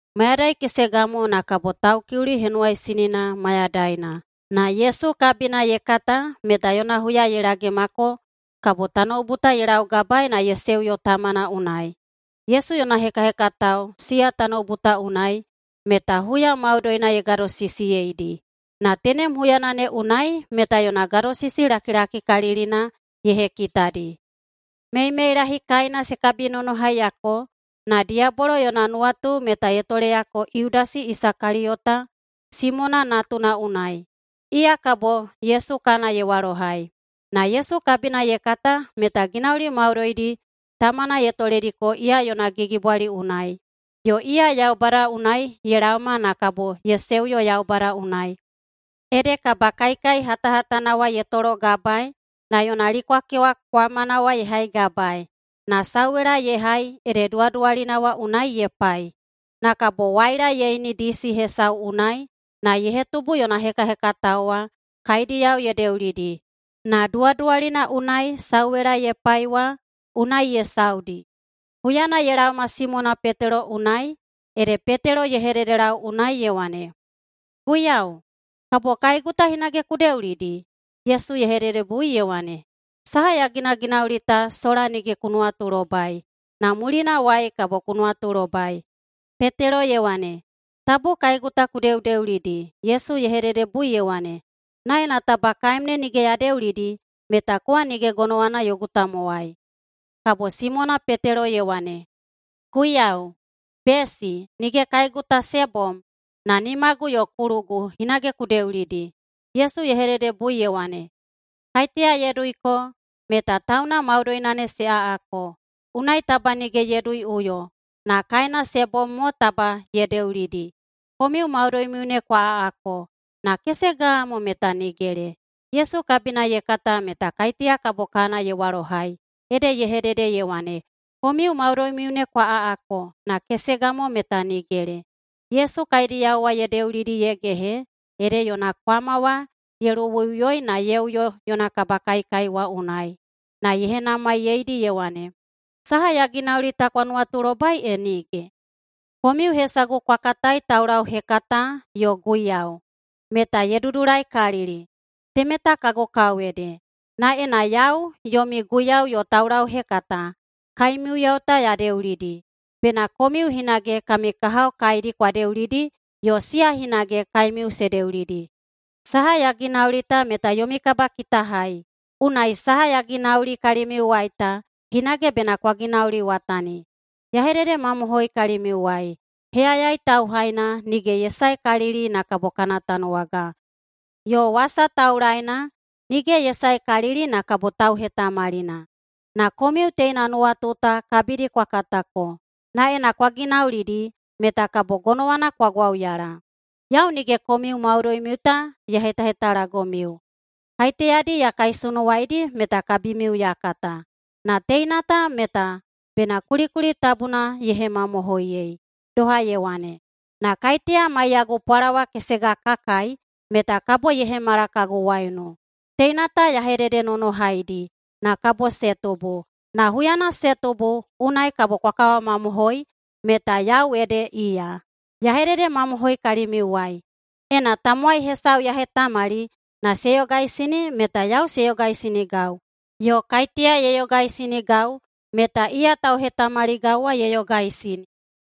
Mayadai kesega mo na kabo Taukiuli Henuwaisinina mayadaina, na Yesu kabina ye kata meta yona huya ye lagemako kabo tanoubu ta ye laugabaei na ye seuyo Tamana unai. Yesu yona hekahekatao siya tanoubu ta unai, meta huya maudoina ye gadosisiyeidi, na tenem huyana ne unai meta yona gadosisi lakilakikalilina ye hekitadi. Meimeilahi kaina se kabinonohaiyako, na diyabolo yona nuwatu meta ye toleyako Yudasi Isakaliyota, Simona natuna unai, iya kabo Yesu kana ye walohai. Na Yesu kabina ye kata meta ginauli maudoidi Tamana ye tolediko iya yona gigibwali unai, yo iya Yaubada unai ye laoma na kabo ye seuyo Yaubada unai. Ede kabakaikai hatahatana wa ye tologabaei, na yona likwakewa kwamana ye haigabaei, na sauwela ye hai ede duwaduwalina wa unai ye pai. Na kabo waila ye ini disi hesau unai, na ye hetubu yona hekahekatao wa kaediyao ye deulidi, na duwaduwalina unai sauwela ye pai wa unai ye saudi. Huyana ye laoma Simona Petelo unai, ede Petelo ye hededelau unai ye wane, “Guiyau, kabo kaegu ta hinage ku deulidi?” Yesu ye hededebui ye wane, “Saha ya ginaginauli ta sola nige ku nuwatulobai, na mulinawai kabo ku nuwatulobai.” Petelo ye wane, “Tabu kaegu ta ku deudeulidi!” Yesu ye hededebui ye wane, “Na ena taba [kaem ne] nige ya deulidi, meta kowa nige gonowana yogu tamowai.” Kabo Simona Petelo ye wane, “Guiyau, besi, nige kaegu ta se bom, na nimagu yo kulugu hinage ku deulidi.” Yesu ye hededebui ye wane, “Kaiteya ye duiko meta tauna maudoina ne se aꞌako, unai taba nige ye duiꞌuyo, na kaena se bom mo taba ye deulidi. Komiu maudoimiu ne kwa aꞌako, na kesega mo meta nigele.” Yesu kabina ye kata meta kaiteya kabo kana ye walohai, ede ye hedede ye wane, “Komiu maudoimiu ne kwa aꞌako, na kesega mo meta nigele.” Yesu kaediyao wa ye deulidi ye gehe, ede yona kwama wa ye luwuiꞌuyoi na ye uyo yona kabakaikai wa unai, na ye henamaiyeidi ye wane, “Saha ya ginauli ta kwa nuwatulobai e nige? Komiu hesagu kwa katai Taulauhekata yo Guiyau. Meta ye dudulaikalili. Temeta kagu kao ede. Na ena yau, yomi Guiyau yo Taulauhekata, kaemiyao ta ya deulidi, bena komiu hinage kami kahao kaedi kwa deulidi yo siya hinage kaemiu se deulidi. Saha ya ginauli ta meta yomi kabakitahai. Unai saha ya ginauli kalimiuwai ta, hinage bena kwa ginauliwatani. Ya hededemamohoi kalimiuwai: Heyayai tauhaina nige ye saekalili na kabo kana tanuwaga. Yo wasa taulaena nige ye saekalili na kabo tauhetamalina. Na komiu teina nuwatu ta kabidi kwa katako, na ena kwa ginaulidi, meta kabo gonowana kwa gwauyala. Yau nige komiu maudoimiu ta ya hetahetalagomiu. Kaiteyadi ya kaisunuwaidi meta kabimiu ya kata. Na teina ta meta bena kulikuli tabuna ye hemamohoiyei, doha ye wane, ‘Na kaiteya maiyagu pwalawa kesega ka kai, meta kabo ye hemala kagu waiunu.’ Teina ta ya hededenonohaidi, na kabo se tubu. Na huyana se tubu, unai kabo kwa kawamamohoi meta Yau ede Iya. Ya hededemamohoi kalimiuwai: Ena tamowai hesau ya hetamali na se yogaisini meta yau se yogaisinigau. Yo kaiteya ye yogaisinigau meta iya tauhetamaligau wa ye yogaisini.”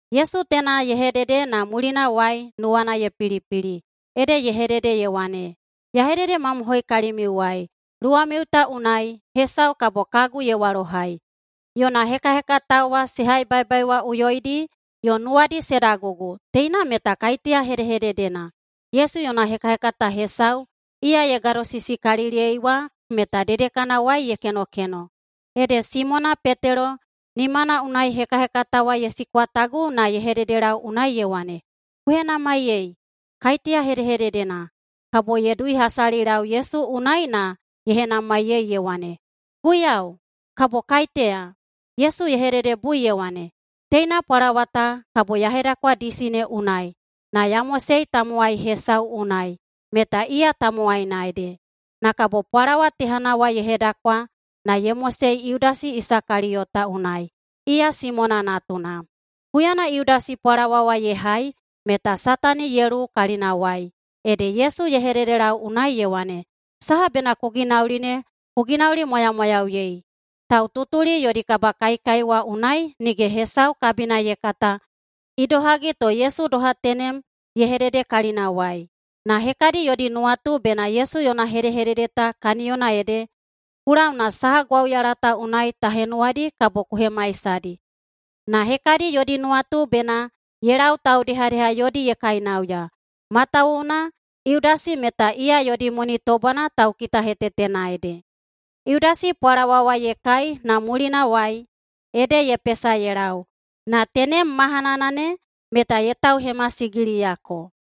Yesu teina ye hedede na mulinawai nuwana ye pilipili, ede ye hedede ye wane, “Ya hededemamohoi kalimiuwai: Luwamiu ta unai hesau kabo kagu ye walohai.” Yona hekahekatao wa se haibaibaiwaꞌuyoidi yo nuwadi se dagugu teina meta kaiteya hedehededena. Yesu yona hekahekata hesau iya ye gadosisikaliliyei wa meta dedekanawai ye kenokeno. Ede Simona Petelo nimana unai hekahekata wa ye sikwatagu na ye hededelau unai ye wane, “Ku henamaiyei, kaiteya hedehededena.” Kabo ye duihasalilau Yesu unai na ye henamaiyei ye wane, “Guiyau, kabo kaiteya?” Yesu ye hededebui ye wane, “Teina pwalawa ta kabo ya hedakwa disi ne unai na ya mosei tamowai hesau unai meta iya tamowaina ede.” Na kabo pwalawa tehana wa ye hedakwa na ye mosei Yudasi Isakaliyota unai, iya Simona natuna. Huyana Yudasi pwalawa wa ye hai meta Satani ye luwu kalinawai. Ede Yesu ye hededelau unai ye wane, “Saha bena ku ginauli ne ku ginaulimwamwayauyei.” Taututuli yodi kabakaikai wa unai nige hesau kabina ye kata idohagi to Yesu doha tenem ye hedede kalinawai. Na hekadi yodi nuwatu bena Yesu yona hedehedede ta kaniyona ede, “Ku lau na saha gwauyala ta unai ta henuwadi kabo ku hemaisadi.” Na hekadi yodi nuwatu bena ye lau taudehadeha yodi ye kainauya. Matawuwuna Yudasi meta iya yodi moni tobwana taukitahetetena ede. Yudasi pwalawa wa ye kai na mulinawai ede ye pesa ye lau. Na tenem mahanana ne meta ye tauhemasigiliyako.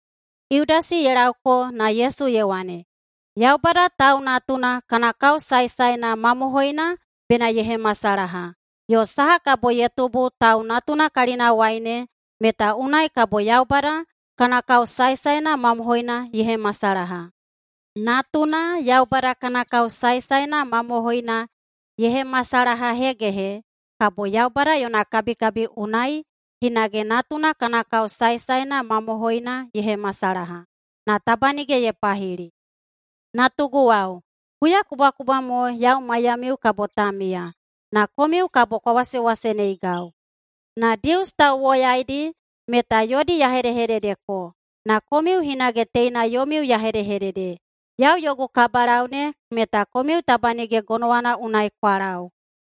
Yudasi ye laoko, na Yesu ye wane, “Yaubada Tau Natuna kana kao saesaena mamohoina bena ye hemasalaha, yo saha kabo ye tubu Tau Natuna kalinawai ne, meta unai kabo Yaubada kana kao saesaena mamohoina ye hemasalaha. Natuna Yaubada kana kao saesaena mamohoina ye hemasalahahegehe, kabo Yaubada yona kabikabi unai hinage Natuna kana kao saesaena mamohoina ye hemasalaha, na taba nige ye pahili. Natuguwao, huyakubwakubwa mo yau maiyamiu kabo ta miya. Na komiu kabo kwa wasewaseneigau. Na Dius tauwoyaidi meta yodi ya hedehededeko, na komiu hinage teina yomiu ya hedehedede: Yau yogu kabalau ne meta komiu taba nige gonowana unai kwa lau.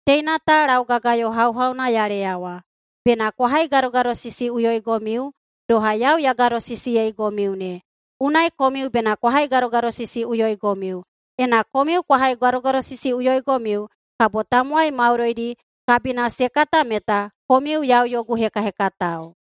Teina ta laugagayo hauhauna ya leyawa: Bena kwa haigadogadosisiꞌuyoigomiu, doha yau ya gadosisiyeigomiu ne. Unai komiu bena kwa haigadogadosisiꞌuyoigomiu. Ena komiu kwa haigadogadosisiꞌuyoigomiu, kabo tamowai maudoidi kabina se kata meta komiu yau yogu hekahekatao.”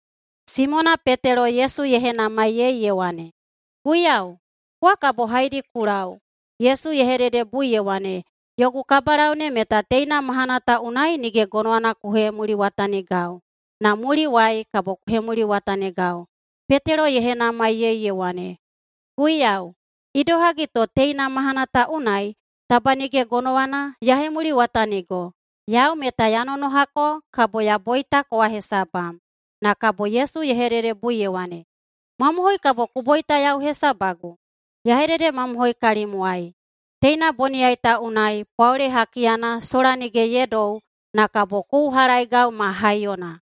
Simona Petelo Yesu ye henamaiyei ye wane, “Guiyau, kowa kabo haedi ku lau?” Yesu ye hededebui ye wane, “Yogu kabalau ne meta teina mahana ta unai nige gonowana ku hemuliwatanigau, na muliwai kabo ku hemuliwatanigau.” Petelo ye henamaiyei ye wane, “Guiyau, idohagi to teina mahana ta unai taba nige gonowana ya hemuliwatanigo? Yau meta ya nonohako kabo ya boita kowa hesabam.” Na kabo Yesu ye hededebui ye wane, “Mamohoi, kabo ku boita yau hesabagu? Ya hededemamohoi kalimwai: Teina boniyai ta unai pwaole hakiyana sola nige ye dou, na kabo ku uhalaeigau ma haiyona.”